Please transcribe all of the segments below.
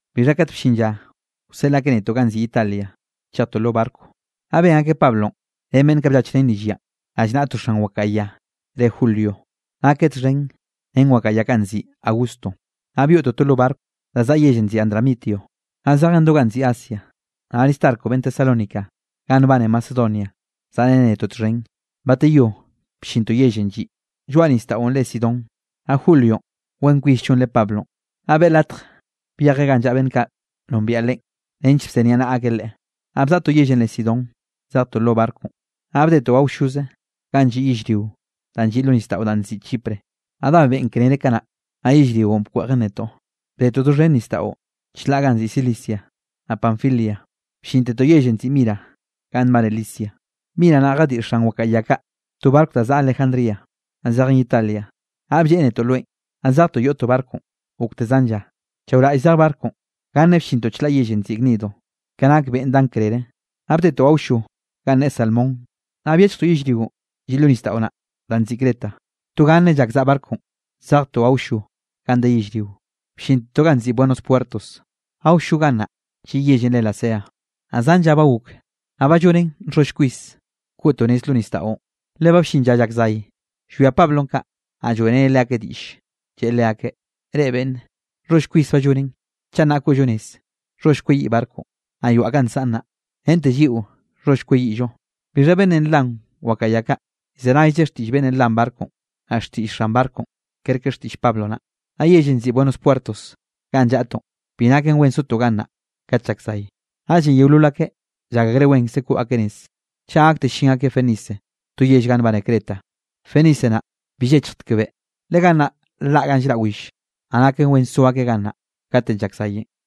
Bixha kat bllin lla wseꞌl akeꞌ netoꞌ ganꞌ nziꞌi Italia, chejtoꞌ lo barco. Naꞌ ben akeꞌ Pablonꞌ ren beꞌnn kaꞌ bllachreneꞌ rill yanꞌ, rallnaꞌa to xan wakaꞌa ya re Julio, nakeꞌ txhen ren wakaꞌa ya kaꞌ nziꞌi Augusto. Naꞌ byoꞌtoꞌ to lo barco da zaꞌa yellenꞌ nziꞌi Adramitio, naꞌ zejen do ganꞌ nziꞌi Asia. Naꞌ Aristarco beꞌnn Tesalónica ga nbane Macedonia, zaꞌreneꞌ netoꞌ txhen. Bateyó bllintoꞌ yellenꞌ lliꞌ lloaꞌ nisdaꞌo re Sidón, naꞌ Julionꞌ, wen kwis llonreꞌ Pablonꞌ, naꞌ beꞌe latj byejeꞌ ganꞌ llaꞌa beꞌnn kaꞌ nombiaꞌ leꞌe nench bzeniaꞌnaꞌa akeꞌ leꞌe. Naꞌ bzaꞌtoꞌ yellenꞌ re Sidón, zejtoꞌ lo barconꞌ, naꞌ bdetoꞌ awlloze ganꞌ lliꞌ yellrio danꞌ lliꞌ lo nisdaꞌo danꞌ nziꞌi Chipre. Naꞌ dá beꞌn krere kanaꞌ, naꞌ yellrionꞌ bkweꞌjen netoꞌ. Bdetoꞌ doxhen nisdaꞌo chlaꞌ ganꞌ nziꞌi Cilicia, naꞌ Panfilia, bllintetoꞌ yellenꞌ nziꞌi Mira ga nbane Licia. Mira naꞌ jadiꞌ xan wakaꞌa ya kaꞌ to barco da zaꞌa Alejandría, naꞌ zejen Italia, naꞌ blleꞌe netoꞌ loenꞌ. Naꞌ zejtoꞌ yoꞌtoꞌ barconꞌ gokte zan lla, chaoraꞌll zej barconꞌ, ganne bllintoꞌ chlaꞌ yellenꞌ nziꞌi Gnido. Ka nak beꞌn dan krere, naꞌ bdetoꞌ awllo ganꞌ ne Salmón, naꞌ byechjtoꞌ yellrionꞌ lliꞌ lo nisdaꞌo naꞌ danꞌ nziꞌi Creta. To ganne llak zaꞌa barconꞌ, zejtoꞌ awllo ga de yellrio, bllintetoꞌ ga nziꞌi Buenos Puertos, awllo gannaꞌ lliꞌ yellenꞌ re Lasea. Naꞌ zan lla ba gok, naꞌ ba llonen nxholl kwis koꞌtoꞌ nez lo nisdaꞌon, le ba bllin lla llak zay. Llwia Pablonꞌ kaꞌ, naꞌ lloeꞌreneꞌ leakeꞌ diꞌll. Lleꞌe leakeꞌ: —Reꞌ beꞌnne, nxholl kwis ba llonen, chaꞌ nnaꞌ koꞌllo nez, nxholl kweyiꞌ barconꞌ, naꞌ yoaꞌ kaꞌ nsaꞌn naꞌ, rente lliꞌo nxholl kweyiꞌllo. Bixha beꞌnnenꞌ nlan wakaꞌa ya kaꞌ, llzenaylleꞌ xtiꞌll beꞌnnenꞌ nlan barconꞌ, naꞌ xtiꞌll xan barconꞌ kerke xtiꞌll Pablo naꞌ. Naꞌ yellenꞌ nziꞌi Buenos Puertos ganꞌ llaꞌtoꞌn, bi naken wen sotoꞌ gannaꞌ kat llak zay, naꞌllenꞌ yeolol akeꞌ llak akreꞌ wenkze koꞌ akeꞌ nez, chaꞌ gakte llin akeꞌ Fenice to yell ga nbane Creta. Fenice naꞌ bill llechjtek beꞌ, le gannaꞌ nlaꞌ ga llraꞌ will, naꞌ naken wen so akeꞌ gannaꞌ katenꞌ llak zayenꞌ.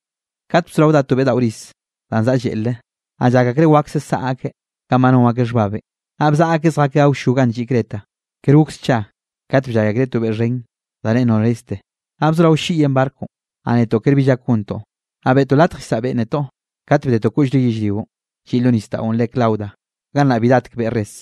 Kat bzorao dá to beꞌ daꞌo riz danꞌ zaꞌa lleꞌlre, naꞌ llak akreꞌ wakse saꞌa akeꞌ kanꞌ ba non akeꞌ xhbabenꞌ. Naꞌ bzaꞌa akeꞌ zjakeꞌ awllo ganꞌ lliꞌ Creta. Ker gok scha kat bllay akreꞌ to beꞌ xhen da re Noreste. Naꞌ bzorao ll-lliꞌyen barconꞌ, naꞌ netoꞌ ker bi llak gontoꞌ, naꞌ beꞌtoꞌ latj llsaꞌa beꞌn netoꞌ. Kat bdetoꞌ koꞌllre yellrionꞌ lliꞌ lo nisdaꞌon re Clauda, gannaꞌ bi datek beꞌn res.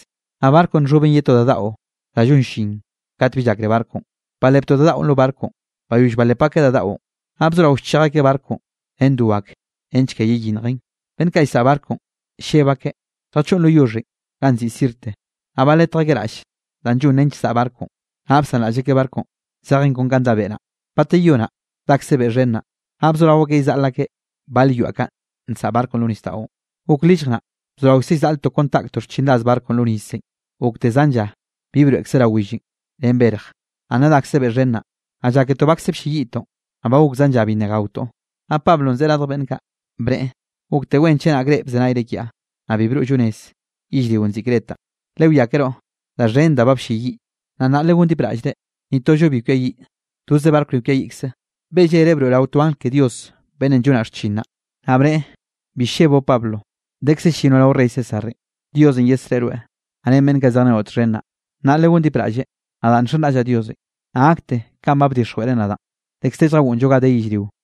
Naꞌ barconꞌ nxhoben ye to da daꞌo da llon llin kat bi llakre barconꞌ, baleptoꞌ da daꞌon lo barconꞌ. Bayoll balep akeꞌ da daꞌon, naꞌ bzorao llchej akeꞌ barconꞌ ren do ake nench ke yeyinnjen. Beꞌnn kaꞌ llsaꞌa barconꞌ, lleb akeꞌ lljachoꞌn lo yoxhenꞌ ganꞌ nziꞌi Sirte. Naꞌ baletj akeꞌ raꞌll danꞌ llon nench zaꞌa barconꞌ. Naꞌ bsanraꞌll akeꞌ barconꞌ zejen kon kanꞌ dá beꞌ naꞌ. Bateyó naꞌ dakze beꞌ xhen naꞌ, naꞌ bzorao akeꞌ llzaꞌl akeꞌ bal yoaꞌ kaꞌ nsaꞌa barconꞌ lo nisdaꞌon. Gok lillj naꞌ, bzoraokze llzaꞌltoꞌ kon taꞌktoꞌ xchinraz barconꞌ lo nisenꞌ. Gokte zan lla bi broeꞌkze rao willenꞌ ren berj, naꞌ nna dakze beꞌ xhen naꞌ, naꞌ lláketoꞌ bakze blleyiꞌtoꞌn. Naꞌ ba gok zan lla bi nna gaotoꞌ, naꞌ Pablonꞌ bzeꞌe radj beꞌnn kaꞌ, bneꞌe: —Gokte wen chenak reꞌ bzenayre kiaꞌ, naꞌ bi broꞌllo nez yellrionꞌ nziꞌi Cretanꞌ, lewiakeroꞌ da xhen da ba blleyiꞌ. Naꞌ nnaꞌ legondipraꞌlle, ni tollo bi kwiayiꞌ, toze barco ni kwiayiꞌkze. Beꞌe llere broeꞌrao to angl ke Dios beꞌnnenꞌ llonaꞌ xchin naꞌ. Naꞌ bneꞌe: “Bi lleboꞌ Pablo, dekze llinoꞌ rao rey César, Diosenꞌ yesreꞌe rweꞌ, naꞌ ren beꞌnn kaꞌ zejrenoꞌ txhen naꞌ.” Naꞌ legondipraꞌlle, nadaꞌ nxenraꞌllaꞌ Diosenꞌ, naꞌ gakte kanꞌ ba bdixjweꞌreꞌ nadaꞌn. Dekz de lljagoꞌnnllo ga de yellrio.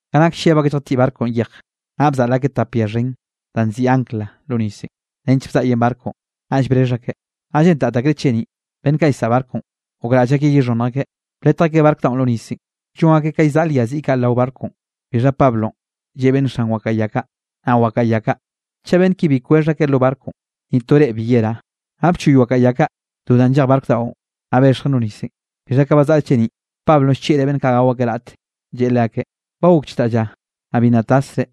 Ka nak lleb akeꞌ lljatiꞌ barconꞌ yej, naꞌ bzaꞌl akeꞌ tap ya xhen danꞌ nziꞌi ancla lo nisenꞌ nench bzaꞌyen barconꞌ, naꞌll brexh akeꞌ, naꞌ lleꞌntat akreꞌ cheniꞌ. Beꞌnn kaꞌ llsaꞌa barconꞌ, gokraꞌll akeꞌ yexhonnj akeꞌ, bletj akeꞌ barco daꞌon lo nisenꞌ, llon akeꞌ ka llzaꞌl ya ziꞌ kaꞌ rao barconꞌ. Bixha Pablonꞌ lleꞌe beꞌnn xan wakaꞌa ya kaꞌ, naꞌ wakaꞌa ya kaꞌ: —Chaꞌ beꞌnn ki bi kwexh akeꞌ lo barconꞌ, ni to reꞌ bi yerá. Naꞌ bchoy wakaꞌa ya kaꞌ do danꞌ nllej barco daꞌon, naꞌ bexjen lo nisenꞌ. Bixha ka bazaꞌa cheniꞌn, Pablonꞌ llchieꞌreꞌ beꞌnn kaꞌ gao akeꞌ raꞌte, lleꞌe leakeꞌ: —Ba gok chdaꞌ lla, naꞌ bi nna tasre,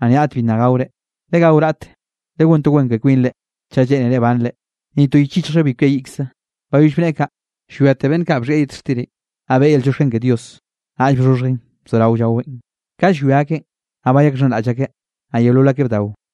naꞌ ni raꞌt bi nna gaore. Legao raꞌt, legón to wen ke kwinre chaꞌ lleꞌnere banre, ni to yich yichjllo bi kwiayiꞌkze. Bayoll bneꞌe kaꞌ, llwiate beꞌnn kaꞌ bxhieꞌ yet xtir, naꞌ beꞌe yel llioxken ke Dios, naꞌll bxhoxhjeꞌn bzorao llaweꞌn. Ka llwia akeꞌn, naꞌ bayakxhenraꞌll akeꞌ, naꞌ yeolol akeꞌ bdao.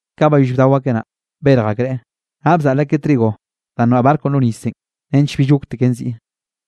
Ka bayoll bdao akeꞌ naꞌ, berj akreꞌ, naꞌ bzaꞌl akeꞌ trigo danꞌ noaꞌ barconꞌ lo nisenꞌ nench bill gokteken ziꞌ.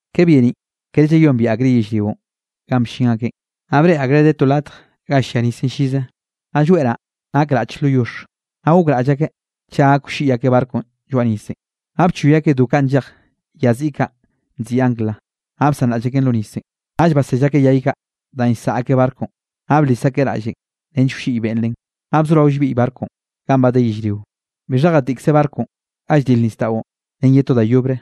Ka byeniꞌn kere llayombieꞌ akreꞌ yellrionꞌ ganꞌ bllin akeꞌn, naꞌ breꞌe akreꞌ de to latj ga llia nisenꞌ llize, naꞌ lloeꞌ naꞌ, nak raꞌch lo yoxh. Naꞌ gokraꞌll akeꞌ chaꞌ gak wlliꞌy akeꞌ barconꞌ lloaꞌ nisenꞌ. Naꞌ bchoy akeꞌ do kaꞌ nllej ya ziꞌi kaꞌ nziꞌi ancla, naꞌ bsanraꞌll akeꞌn lo nisenꞌ. Naꞌll basell akeꞌ yay kaꞌ danꞌ llsaꞌa akeꞌ barconꞌ, naꞌ blis akeꞌ raꞌllenꞌ nench wlliꞌy beꞌn len. Naꞌ bzorao llbiꞌy barconꞌ ganꞌ ba de yellrio. Bixha jatiꞌkze barconꞌ ga lldil nisdaꞌon ren ye to da yobre,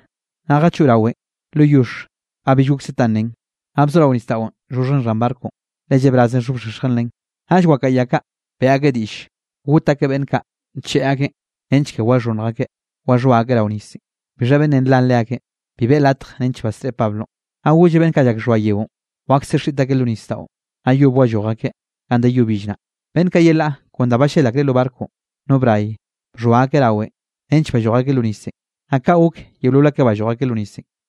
naꞌ jachoꞌ rawenꞌ lo yoxh ga bill gokse ta nnen, naꞌ bzorao nisdaꞌon llxhoxhjen xhan barconꞌ, le llebrazenꞌ nxhobxexjen len. Naꞌll wakaꞌa ya kaꞌ beꞌe akeꞌ diꞌll got akeꞌ beꞌnn kaꞌ ncheꞌe akeꞌn, nench ke waxhonnj akeꞌ waxhoa akeꞌ rao nisenꞌ. Bixha beꞌnnenꞌ nlan leakeꞌn, bi beꞌe latj nench basreꞌe Pablonꞌ. Naꞌ golleꞌ beꞌnn kaꞌ llak llxhoa yeonꞌ, wakse xiꞌt akeꞌ lo nisdaꞌon, naꞌ yob walloj akeꞌ ganꞌ de yo bill naꞌ. Beꞌnn kaꞌ yelaꞌ, kon da ballel akreꞌ lo barconꞌ, no bray, bxhoa akeꞌ rawenꞌ, nench balloj akeꞌ lo nisenꞌ. Naꞌ kaꞌ gok yeolol akeꞌ balloj akeꞌ lo nisenꞌ.